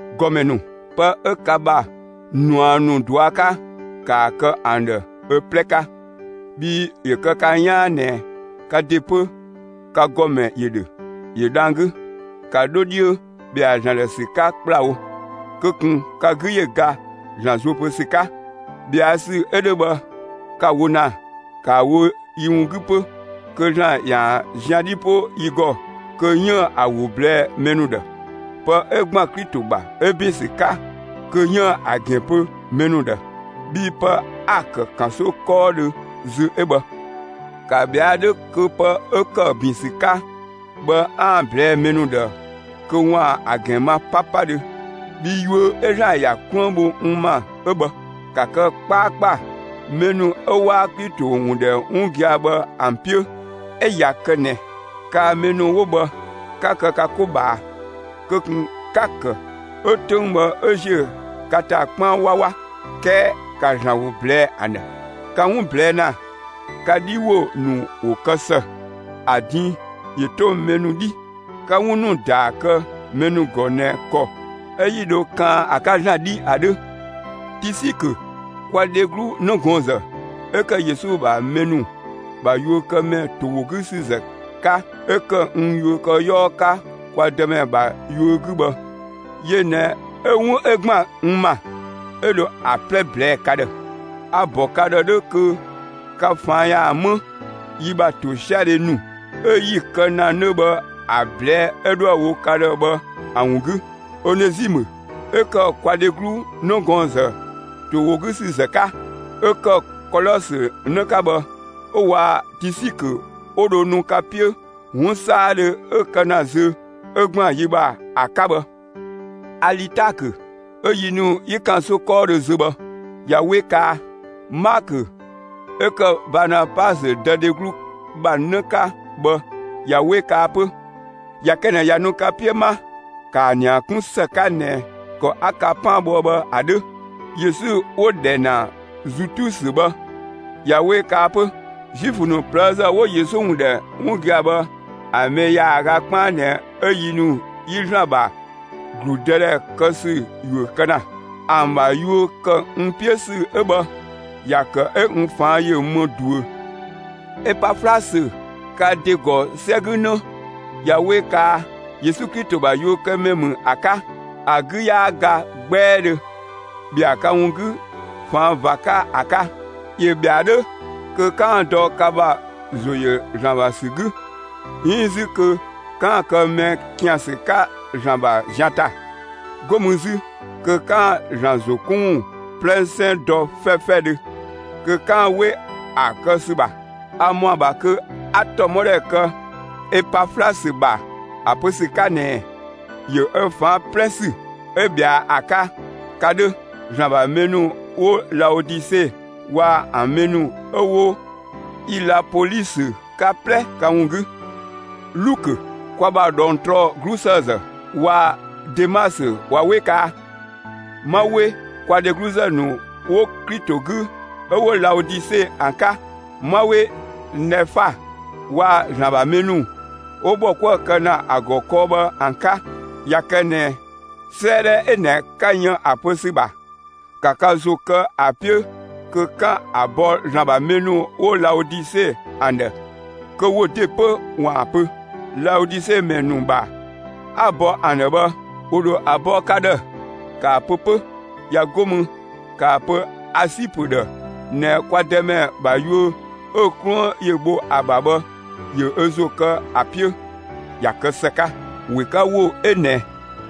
‑Gɔmɛ ‑nu, pë 'ö ka ‑bha ꞊nua ‑nu ꞊dua' 'ka, ‑kaa kë ‑an ‑dhë ö 'plɛ 'ka! Bhii ‑yö kë ka 'yaan ꞊nɛ ka ‑de 'pö, ka ‑gɔmɛ ‑yö ‑dhö; ‑yö dhang‑ 'gü. ‑Ka 'dho 'dhiö ‑bhɛa ‑Zlan ‑dhë ‑sü 'ka ‑kplawo! Kö ꞊kun ka 'gü ‑yö ga ‑Zlan zuö pö ‑sü 'ka! ꞊Bhɛa' ‑sü 'ö 'dhö bhë, ka‑ wo ‑na, ‑kaa wo yi ‑wun 'gü 'pö, kö ‑Zlan ‑yaan zian 'dhi 'po yi ‑gɔ kö 'yiën‑ ‑a ‑wo ꞊blɛɛ'‑ mɛ ‑nu ‑dhë, pë 'ö ‑gban Klito ‑bha 'ö ‑bin ‑sü 'ka kö 'yiën‑ ‑a ‑gɛn pö mɛ ‑nu ‑dhë. Bhii pë 'a‑ ‑kë ‑kanso 'kɔɔdhö zö 'ö bhë. ‑Ka ꞊bhɛa' 'dhö kö pë 'ö ‑kë ‑bin ‑sü 'ka bhë 'aan‑ ‑a ꞊blɛɛ'‑ mɛ ‑nu ‑dhë kö ‑waan ‑a ‑gɛn ma 'papadhö; bhii yuö 'ö ‑Zlan ‑ya 'kluën bho n ‑ma 'ö bhë. ‑Ka kë 'kpaakpa mɛ ‑nu 'ö 'waa Klito ‑wun ‑dhɛ 'wun gia‑ bhë ‑an 'piö! 'Ö ꞊ya kë ꞊nɛ kaa‑ mɛ ‑nu 'wo bhë, 'ka kë ka 'ko ꞊bhaa, kö ꞊kun 'ka‑ ‑kë 'ö 'töng bhë 'ö ‑ziö ka ‑ta 'kpaan 'wawa, 'kɛɛ ‑ka ‑Zlan ‑wo ꞊blɛɛ'‑ ‑an ‑dhë! Ka 'wun ꞊blɛɛ' ‑na, ka 'dhi ‑wo ‑nu ‑wo kë ‑së, ‑a din ‑yö 'to mɛ ‑nu 'dhii! 'Ka 'wun ‑nu ‑daa kë mɛ ‑nu ‑gɔ ꞊nɛ ‑kɔ 'ö‑ 'yi dho ‑kan ‑a 'ka ‑Zlan 'dhi ‑a 'dhö! Tisikö, kwa dheglu 'nëgɔɔnzë 'ö ‑kë Yesu ‑bha mɛ ‑nu ‑bha yuökëmɛ ‑to ‑wo 'gü ‑sü ‑zë 'ka, 'ö ‑kë n yuökëyɔɔ 'ka kwa Dëmɛ ‑bha yuö 'gü bhë, yö ꞊nɛ 'ö 'wun 'ö ‑gban n ‑ma, 'ö dho ‑a 'plɛ ꞊blɛɛ'‑ ka ‑dhë. A‑ ‑bɔ ka ‑dhë 'dhö kö ka ꞊faan' ‑yaan 'më yi ‑bha ‑tosiadhe ‑nu 'ö 'yi‑ kë ‑na 'nö bhë ‑a ꞊blɛɛ'‑ 'ö 'dhoë‑ wo ka ‑dhë bhë ‑a ‑wun 'gü. Onezimë 'ö ‑kë kwa dheglu 'nëgɔɔnzë ‑to ‑wo 'gü ‑sü ‑zë 'ka, 'ö ‑kë Kolɔsö 'në 'ka bhë, 'ö waa‑ Tisikö 'wo dho nu ka 'piö 'wun 'saadhö 'ö kë ‑na zö, 'ö ‑gban yi ‑bha ‑a 'ka bhë. Alitaakö 'ö yi ‑nu 'yi ‑kanso 'kɔɔdhö zö bhë, ꞊ya 'we kaa! Maakö 'ö ‑kë Baanabasö dë dheglu ‑bha 'në 'ka bhë, ꞊ya 'we kaa 'pö! ꞊Ya kë ꞊nɛ ꞊ya nu ka 'piö 'ma, ‑kaa ‑nia 'kun ‑së 'ka ꞊nɛ ‑kɔ 'a ka 'paan bhoë bhë ‑a 'dhö! Yesu 'wo‑ ‑dhɛ ‑na Zutusö bhë, ꞊ya 'we kaa 'pö. Zuifö ‑nu ꞊plëëzë 'wo Yesu ‑wun ‑dhɛ 'wun gia‑ bhë ‑a mɛ ‑yaaga 'kpaan ꞊nɛ 'ö yi ‑nu 'yi ‑Zlan ‑bha ‑gludëdhɛ kë ‑sü ‑yuö kë ‑na. ‑An ‑bha yuö ‑kë n 'piö ‑sü 'ö bhë, ‑ya ‑kë 'ö n ꞊faan' ‑yö më ꞊duö. Epaflasö, ka ‑de ‑gɔ 'sɛ 'gü 'në, ꞊ya 'we kaa! Yesu Klito ‑bha yuökëmɛ ‑mü ‑a 'ka. ‑A 'gü 'yaa ga 'gbɛɛdhö ꞊bhɛa' ka ‑wun 'gü ꞊faan' ꞊va 'ka ‑a 'ka. ‑Yö ꞊bhɛa'‑ 'dhö kö 'kaan‑ dɔ ka ‑bha ‑zo ‑yö ‑Zlan ‑bha ‑sü 'gü, 'iin 'zü kö 'kaan‑ kë mɛ ‑kiansü 'ka ‑Zlan ‑bha zian ‑ta. 'Go mü zü kö 'kaan‑ ‑Zlan ‑zo 'kun ‑wun 'plɛsɛn dɔ 'fɛfɛdhö kö 'kaan‑ 'we ‑a kë ‑sü ‑bha. A ‑mɔa ‑bha kö 'a ‑tɔmɔdhɛ kë Epaflasö ‑bha ‑a pö ‑sü 'ka ꞊nɛɛ: ‑Yö ö ꞊faan' 'plɛ ‑sü 'ö ꞊bhɛa ‑a 'ka, ka 'dhö, ‑Zlan ‑bha mɛ ‑nu 'wo Laodise waa‑ ‑an mɛ ‑nu 'ö 'wo Ilapolisö ka 'plɛ ka ‑wun 'gü. Lukö, kwa ‑bha ꞊dhɔngtrɔ 'glusëëzë waa‑ Demasö ꞊wa 'we kaa! 'Ma 'we kwa dhegluzë ‑nu 'wo Klito 'gü 'ö 'wo Laodise ‑an 'ka! 'Ma 'we Nɛfa waa‑ ‑Zlan ‑bha mɛ ‑nu 'wo bhɔ 'kuë‑ kë ‑na ‑a ‑gɔ kɔɔ bhë ‑an 'ka! ꞊Ya kë ꞊nɛ 'sëëdhɛ 'ö ꞊nɛ 'ka yën ‑a pö ‑sü ‑bha, ‑ka ka ‑zo kë ‑a 'piö kö 'kaan‑ ‑a bɔ ‑Zlan ‑bha mɛ ‑nu 'wo Laodise ‑an ‑dhë, kö wo ‑de 'pö ‑waan ‑a pö. Laodise ‑mɛ ‑nu ‑bha 'a‑ bɔ ‑an ‑dhë bhë, ‑wo ‑dho ‑a bɔ ka ‑dhë; ‑kaa pö 'pö! ꞊Ya 'go mü, ‑kaa pö Asipö ‑dhë ꞊nɛ kwa Dëmɛ ‑bha yuö 'ö‑ 'kluën ‑yö bho ‑a ‑bha bhë, ‑yö ö ‑zo kë ‑a 'piö, ‑ya kë ‑së 'ka! ꞊Wekawo 'ö ꞊nɛ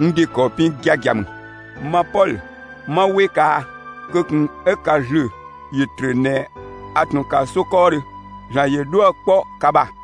n ‑de ‑kɔ pin giagia ‑mü: Ma Pɔlö, 'ma 'we kaa! Kö ꞊kun 'ö ka ‑zlö ‑yö ‑trö ꞊nɛ a ꞊tun ‑kanso 'kɔɔdhö! ‑Zlan ‑yö 'dhuë‑ kpɔ ka ‑bha!